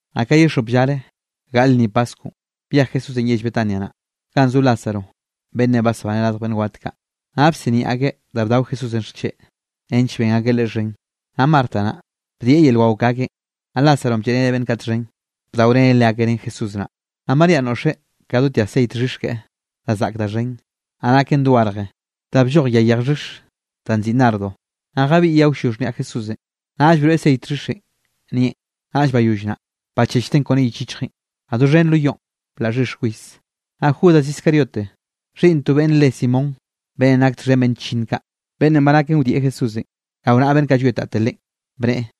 Naꞌ ka ye xop llare gaꞌle lnni paskwnꞌ, byej Jesúsenꞌ yell Betania naꞌ, ganꞌ zo Lázaro beꞌnnenꞌ basbaneꞌ radj beꞌnn wat kaꞌ. Naꞌ bsiniaꞌ akeꞌ da bdao Jesúsenꞌ xcheꞌ, nench ben akeꞌ Leꞌe xhen. Naꞌ Marta naꞌ, bdieꞌ yel wao ke akeꞌn, naꞌ Lázaronꞌ blleꞌreneꞌ beꞌnn kaꞌ txhen, bdaoreneꞌ leakeꞌ ren Jesús naꞌ. Naꞌ Maríanꞌ noꞌxeꞌ ka do tya ceit xhix keꞌe da zaꞌk da xhen, naꞌ naken dogarje da blloj yay yej xhix danꞌ nziꞌi nardo. Naꞌ jabiꞌyeꞌ awllo xhniaꞌ Jesúsenꞌ, naꞌll broeꞌ ceit xhixenꞌ nieꞌn. Naꞌll bayoll naꞌ, bachechteꞌn kone yich yichjeꞌn. Naꞌ doxhen lo yoꞌn, blaꞌ xhix kwis. Naꞌ Judas Iscariote xhiꞌnn to beꞌnn re Simón, beꞌnnenꞌ nak txhen beꞌnn chllinn kaꞌ, beꞌnnenꞌ ba naken wdieꞌ Jesúsenꞌ rao naꞌa beꞌnn kaꞌ llwietate Leꞌen, bneꞌe: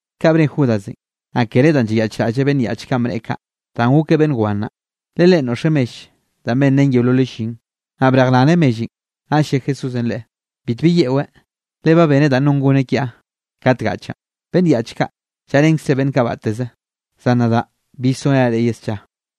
Kaꞌ bne Judasenꞌ, naꞌ kere danꞌ llayaꞌchraꞌlleꞌ beꞌnn yaꞌch kaꞌn bneꞌe kaꞌ, danꞌ gokeꞌ beꞌnn wan naꞌ. Le leꞌen noꞌxeꞌ mell danꞌ benrén yeololeꞌ llin, naꞌ brejraneꞌ mellenꞌ. Naꞌll lle Jesúsenꞌ leꞌe: —Bitbi yeꞌweꞌ, le ba beneꞌ da non goneꞌ kiaꞌ kat gaꞌchaꞌn. Beꞌnn yaꞌch kaꞌ, llaꞌrenkzre beꞌnn kaꞌ batteze, zan nadaꞌ bill sorenaꞌ reꞌ ye scha.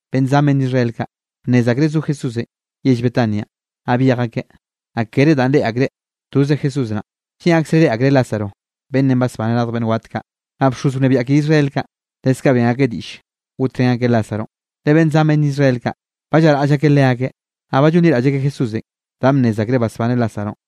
Beꞌnn zan beꞌnn Israel kaꞌ, bnnez akreꞌ zo Jesúsenꞌ yell Betanianꞌ, naꞌ byej akeꞌ, naꞌ kere danꞌ reꞌe akreꞌ toze Jesús naꞌn, lleꞌn akzereꞌ reꞌe akreꞌ Lázaro beꞌnnenꞌ basbaneꞌ radj beꞌnn wat kaꞌ. Naꞌ bxoz wnebiaꞌ ke Israel kaꞌ, leskaꞌ ben akeꞌ diꞌll gotrén akeꞌ Lázaronꞌ, le beꞌnn zan beꞌnn Israel kaꞌ, ba llaraꞌll akeꞌ leakeꞌ, naꞌ ba llonliraꞌll akeꞌ Jesúsenꞌ danꞌ bnnez akreꞌ basbaneꞌ Lázaronꞌ.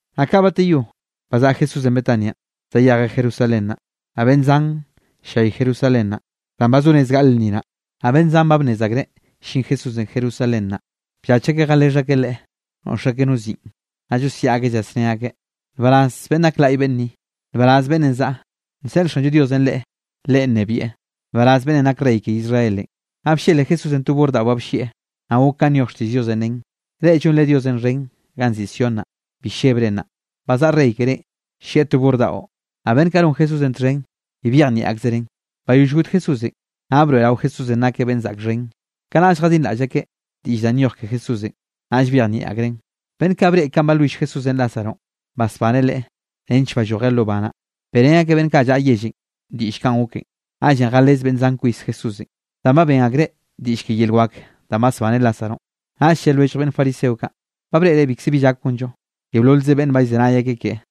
Naꞌ ka bateyó, bazaꞌa Jesúsenꞌ Betanianꞌ zayejeꞌ Jerusalén naꞌ, naꞌ beꞌnn zan llay Jerusalén naꞌ, danꞌ ba zo rez gaꞌle lnni naꞌ. Naꞌ beꞌnn zan ba bnnez akreꞌ llin Jesúsenꞌ Jerusalén naꞌ, bllach akeꞌ jalexh akeꞌ Leꞌe noꞌx akeꞌ no ziꞌn, naꞌ llosiaꞌ akeꞌ llasné akeꞌ: —¡Nbaraz, beꞌnn nak laꞌy beꞌnn ni! ¡Nbaraz beꞌnnenꞌ zaꞌa, nseꞌl Xanllo Diosenꞌ le Leꞌen nnebieꞌ! ¡Nbaraz beꞌnnenꞌ nak Rey ke Israelenꞌ! Naꞌ bllele Jesúsenꞌ to burr daꞌo ba bllieꞌ, naꞌ gok kanꞌ nyoj xtiꞌll Diosenꞌ nen: Reꞌ llonre Diosenꞌ xhen ganꞌ nziꞌi Sión naꞌ, bi llebre naꞌ, ba zaꞌa Rey kerénꞌ llieꞌ to burr daꞌo. Naꞌ beꞌnn kaꞌ non Jesúsenꞌ txhen bi byejnieꞌ akzereꞌn. Bayoll got Jesúsenꞌ, naꞌ broeꞌrao Jesúsenꞌ nakeꞌ beꞌnn zaꞌk xhen, kanaꞌll jadinraꞌll akeꞌ diꞌll kaꞌ nyoj ke Jesúsenꞌ, naꞌll byejnieꞌ akreꞌn. Beꞌnn kaꞌ breꞌe kanꞌ balwill Jesúsenꞌ Lázaronꞌ, basbaneꞌ leꞌe nench ballojeꞌ lo ba naꞌ, beꞌrén akeꞌ beꞌnn kaꞌ llaꞌa yellenꞌ diꞌll kanꞌ goken. Naꞌllenꞌ jalez beꞌnn zan kwis Jesúsenꞌ, danꞌ ba ben akreꞌ diꞌll ke yel wak danꞌ basbaneꞌ Lázaronꞌ. Naꞌll lle lwellj beꞌnn fariseo kaꞌ: —Ba breꞌre bikze bi llak gonllo. Yeololze beꞌnne ba llzenay akeꞌ keꞌe.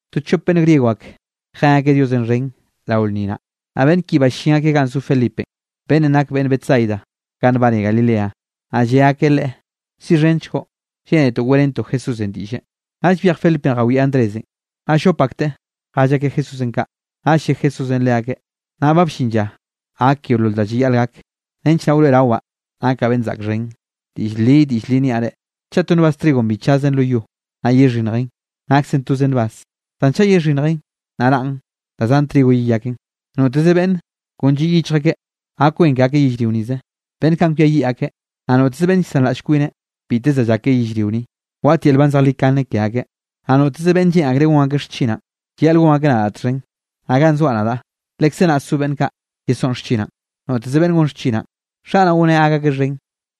To chop beꞌnn griego ak jen akeꞌ Diosenꞌ xhen rao lnni naꞌ. Naꞌ beꞌnn ki ballín akeꞌ ganꞌ zo Felipenꞌ, beꞌnnenꞌ nak beꞌnn Betsaida ganꞌ nbane Galilea, naꞌ lle akeꞌ leꞌe: —Siꞌxhenchgoꞌ, lleꞌnetoꞌ weꞌrentoꞌ Jesúsenꞌ diꞌlle. Naꞌll byej Felipenꞌ jawieꞌ Andrésenꞌ, naꞌll llop akteꞌ jell akeꞌ Jesúsenꞌ kaꞌ. Naꞌll lle Jesúsenꞌ leakeꞌ: —Nnaꞌ ba bllin lla gak yeolol da llayaꞌl gak, nench naꞌ wroeꞌrawaꞌ nakaꞌ beꞌnn zaꞌk xhen. Diꞌll li, diꞌll li niaꞌ reꞌ: Chaꞌ to nbaz trigonꞌ bi chazen lo yo, naꞌ yexhinnjen, naksen toze nbaz; zan chaꞌ yexhinnjen, naꞌ raꞌn, da zan trigo yeyaken. Noteze beꞌnn kon lliꞌ yichj akeꞌ gak wen ke akeꞌ yellrio nize, beꞌnn kaꞌn kwiayiꞌ akeꞌ. Naꞌ noteze beꞌnne llsanraꞌll kwineꞌ, biteze da llak ke yellrio ni, waꞌt yel nban zejlikane ke akeꞌ. Naꞌ noteze beꞌnne lleꞌn akreꞌ gon akeꞌ xchinaꞌn, llayaꞌle gon akeꞌ nadaꞌ txhen. Naꞌ ganꞌ soaꞌ nadaꞌ, lekze naꞌ so beꞌnn kaꞌ yesoꞌn xchinaꞌn. Noteze beꞌnne gon xchinaꞌn, Xaꞌ naꞌ goneꞌ gak akeꞌ xhen.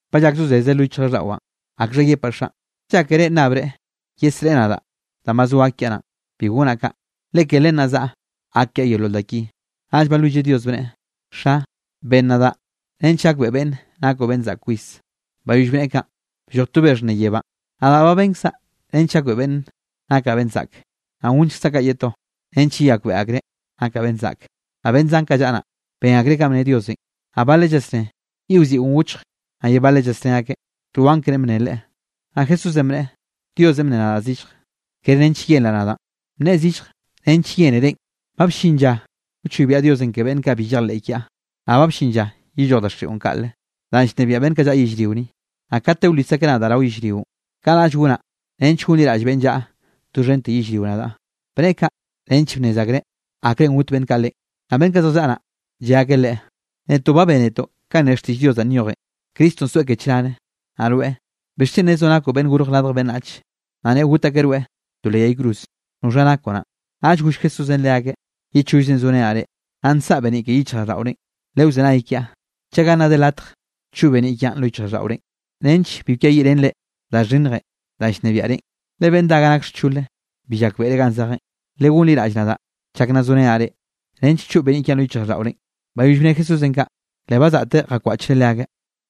’Ba llak zozeze lo yichjraꞌlldaꞌwaꞌn. ¿Akxha yepaꞌ Xaꞌn? ¿Llákere nnabreꞌ yesreꞌe nadaꞌ danꞌ ba zo gak kiaꞌ naꞌn? Bi gonaꞌ kaꞌ, le ke len naꞌ zaꞌa gak kiaꞌ yeolol da ki. Naꞌll balwilleꞌ Dios, bneꞌe: —Xa, ben nadaꞌ nench gakbeꞌe beꞌnne nakoꞌ beꞌnn zaꞌk kwis. Bayoll bneꞌe kaꞌn, blloj to be xhnne yebánꞌ: —Nadaꞌ ba benkzaꞌ nench gakbeꞌe beꞌnn nakaꞌ beꞌnn zaꞌk, naꞌ gonllkzaꞌ kaꞌ ye to, nench yeyakbeꞌe akreꞌ nakaꞌ beꞌnn zaꞌke. Naꞌ beꞌnn zan kaꞌ llaꞌa naꞌ, ben akreꞌ kanꞌ bne Diosenꞌ, naꞌ baleꞌ llasné yiꞌwziꞌon gochj. Naꞌ ye baleꞌ llasné akeꞌ: —To anglenꞌ bneꞌe leꞌe. Naꞌ Jesúsenꞌ bneꞌe: —Diosenꞌ bnneꞌe nadaꞌ zillje, kere nench yenraꞌ nadaꞌn, bnneꞌe zillje nench yene reꞌn. Ba bllin lla wchoybiaꞌ Diosenꞌ ke beꞌnn kaꞌ bi llejleꞌ kiaꞌ. Naꞌ ba bllin lla yelloj daxiꞌon kaꞌle, danꞌ llnebiaꞌ beꞌnn kaꞌ llaꞌa yellrio ni. Naꞌ kate wlis akeꞌ nadaꞌ rao yellrionꞌ, kanaꞌll gonaꞌ nench gonliraꞌll beꞌnn llaꞌa doxhente yellrio nadaꞌ. Bneꞌe kaꞌ nench bnnez akreꞌ akrenꞌ got beꞌnn kaꞌ Leꞌen. Naꞌ beꞌnn kaꞌ zjallaꞌa naꞌ, lle akeꞌ leꞌe: —Netoꞌ ba bénetoꞌ kanꞌ ne xtiꞌll Dios danꞌ nyojen, Cristonꞌ soeꞌ ke chnare. Naꞌ rweꞌ, ¿bixchen nezoꞌ nakoꞌ Beꞌnn Gorj Radj Beꞌnnach, naꞌ neꞌo got akeꞌ rweꞌ to leꞌ yay cruze? ¿Noxha nakoꞌ naꞌn? Naꞌll goll Jesúsenꞌ leakeꞌ: —Ye chollzenꞌ zorenaꞌ reꞌ, naꞌ nsaꞌa beniꞌ ke yichjraꞌlldaꞌorenꞌ. Lewzenay kiaꞌ chaga nna de latje choꞌ beniꞌ kiaꞌn lo yichjraꞌlldaꞌorenꞌ, nench bi kweyiꞌrenre da xhinnjenꞌ danꞌ llnebiaꞌ reꞌn. Le beꞌnn dá ga nak xchole bi llakbeꞌreꞌ ganꞌ zejeꞌn. Legonliraꞌll nadaꞌ chak nna zorenaꞌ reꞌ, nench choꞌ beniꞌ kiaꞌn lo yichjraꞌlldaꞌore. Bayoll bne Jesúsenꞌ kaꞌ, le bazaꞌteꞌ jakwaꞌchreꞌ leakeꞌ.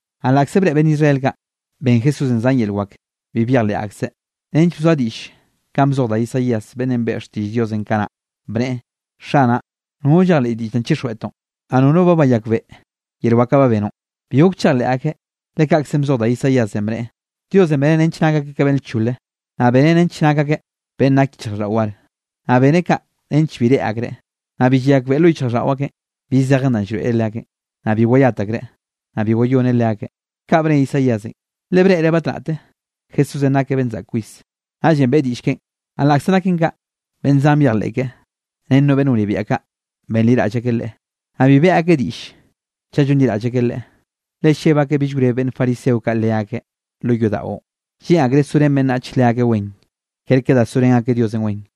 Naꞌ laꞌkze breꞌe beꞌnn Israel kaꞌ, ben Jesúsenꞌ zan yel wak, bi byejleꞌ akzeꞌ, nench bzoa diꞌll kanꞌ bzoj da Isaías beꞌnnenꞌ beꞌe xtiꞌll Diosenꞌ kanaꞌ, bneꞌe: Xanaꞌ, nono llejleꞌ diꞌll danꞌ chixjweꞌtoꞌn, naꞌ nono ba bayakbeꞌe yel wak kaꞌ ba benoꞌn. Bi gok chejleꞌ akeꞌ, le kaꞌkzenꞌ bzoj da Isaíasenꞌ, bneꞌe: Diosenꞌ beneꞌ nench nak akeꞌ ka beꞌnn lchole, naꞌ beneꞌ nench nak akeꞌ beꞌnn nak yichjraꞌlldaꞌo war. Naꞌ beneꞌ kaꞌ nench bi reꞌe akreꞌ, naꞌ bi llayakbeꞌe lo yichjraꞌlldaꞌo akeꞌn bi zejen danꞌ llroeꞌreꞌ leakeꞌn, naꞌ bi wayat akreꞌ, naꞌ bi wayoneꞌ leakeꞌ. Kaꞌ bne Isaíasenꞌ, le breꞌreꞌ batnaꞌte Jesúsenꞌ nakeꞌ beꞌnn zaꞌk kwis, naꞌllenꞌ beꞌe diꞌll keꞌen. Naꞌ laꞌkze naken kaꞌ, beꞌnn zan byejleꞌ keꞌe, ren no beꞌnn wnebiaꞌ kaꞌ, benliraꞌll akeꞌ Leꞌe, naꞌ bi beꞌe akeꞌ diꞌll chaꞌ llonliraꞌll akeꞌ Leꞌe, le lleb akeꞌ bill wreb beꞌnn fariseo kaꞌ leakeꞌ lo yodaꞌon. Lleꞌn akllreꞌ sorén beꞌnnach leakeꞌ wen, kerke da sorén akeꞌ Diosenꞌ wen.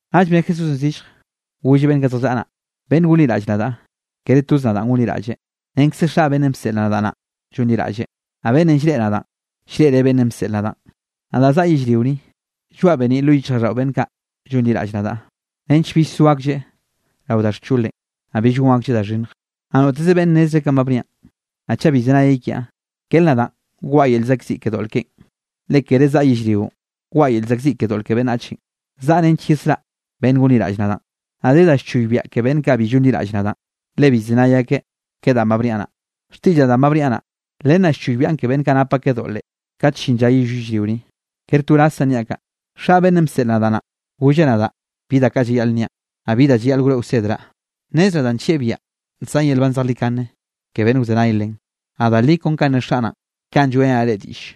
Naꞌll bne Jesúsenꞌ zillje, golleꞌ beꞌnn kaꞌ zjallaꞌa naꞌ: —Beꞌnn gonliraꞌlle nadaꞌ, kere toze nadaꞌn gonliraꞌlleꞌ, renkze Xaꞌ beꞌnnenꞌ bseꞌl nadaꞌ naꞌn llonliraꞌlleꞌ. Naꞌ beꞌnnenꞌ llreꞌe nadaꞌn, llreꞌreꞌ beꞌnnenꞌ bseꞌl nadaꞌn. Nadaꞌ zaꞌa yellrio ni, llgoaꞌ beniꞌ lo yichjraꞌlldaꞌo beꞌnn kaꞌ llonliraꞌll nadaꞌ, nench bill so aklleꞌ rao da xcholenꞌ, naꞌ bill gon aklleꞌ da xhinnj. Naꞌ noteze beꞌnne nnezreꞌ kanꞌ ba bniaꞌn, naꞌ chaꞌ bi llzenayeꞌ kiaꞌ, kere nadaꞌn waꞌa yel llzaꞌkziꞌ ke doꞌl keꞌen, le kere zaꞌa yellrionꞌ waꞌa yel llzaꞌkziꞌ ke doꞌl ke beꞌnnachenꞌ, zaꞌa nench yesraꞌa beꞌnn gonliraꞌll nadaꞌn. Naꞌ de da wchoybiaꞌ ke beꞌnn kaꞌ bi llonliraꞌll nadaꞌn, le bi llzenay akeꞌ ke danꞌ ba bniaꞌ naꞌ, xtiꞌllaꞌ danꞌ ba bniaꞌ naꞌ, len naꞌ choybiaꞌn ke beꞌnn kaꞌ nap akeꞌ doꞌle, kat llin lla yeyoll yellrio ni. Kere to wrazzaꞌn niaꞌ kaꞌ, Xaꞌ beꞌnnenꞌ bseꞌl nadaꞌ naꞌn, golleꞌ nadaꞌ bi da kaꞌ llayaꞌl nniaꞌn, naꞌ bi da llayaꞌl wroeꞌ wsedraꞌ. Nnezraꞌ danꞌ nllieꞌ biaꞌa, nsaꞌn yel nban zejlikane ke beꞌnn wzenay len, naꞌ da li kon kanꞌ ne Xaꞌ naꞌn, kaꞌn lloeꞌrenaꞌ reꞌ diꞌll.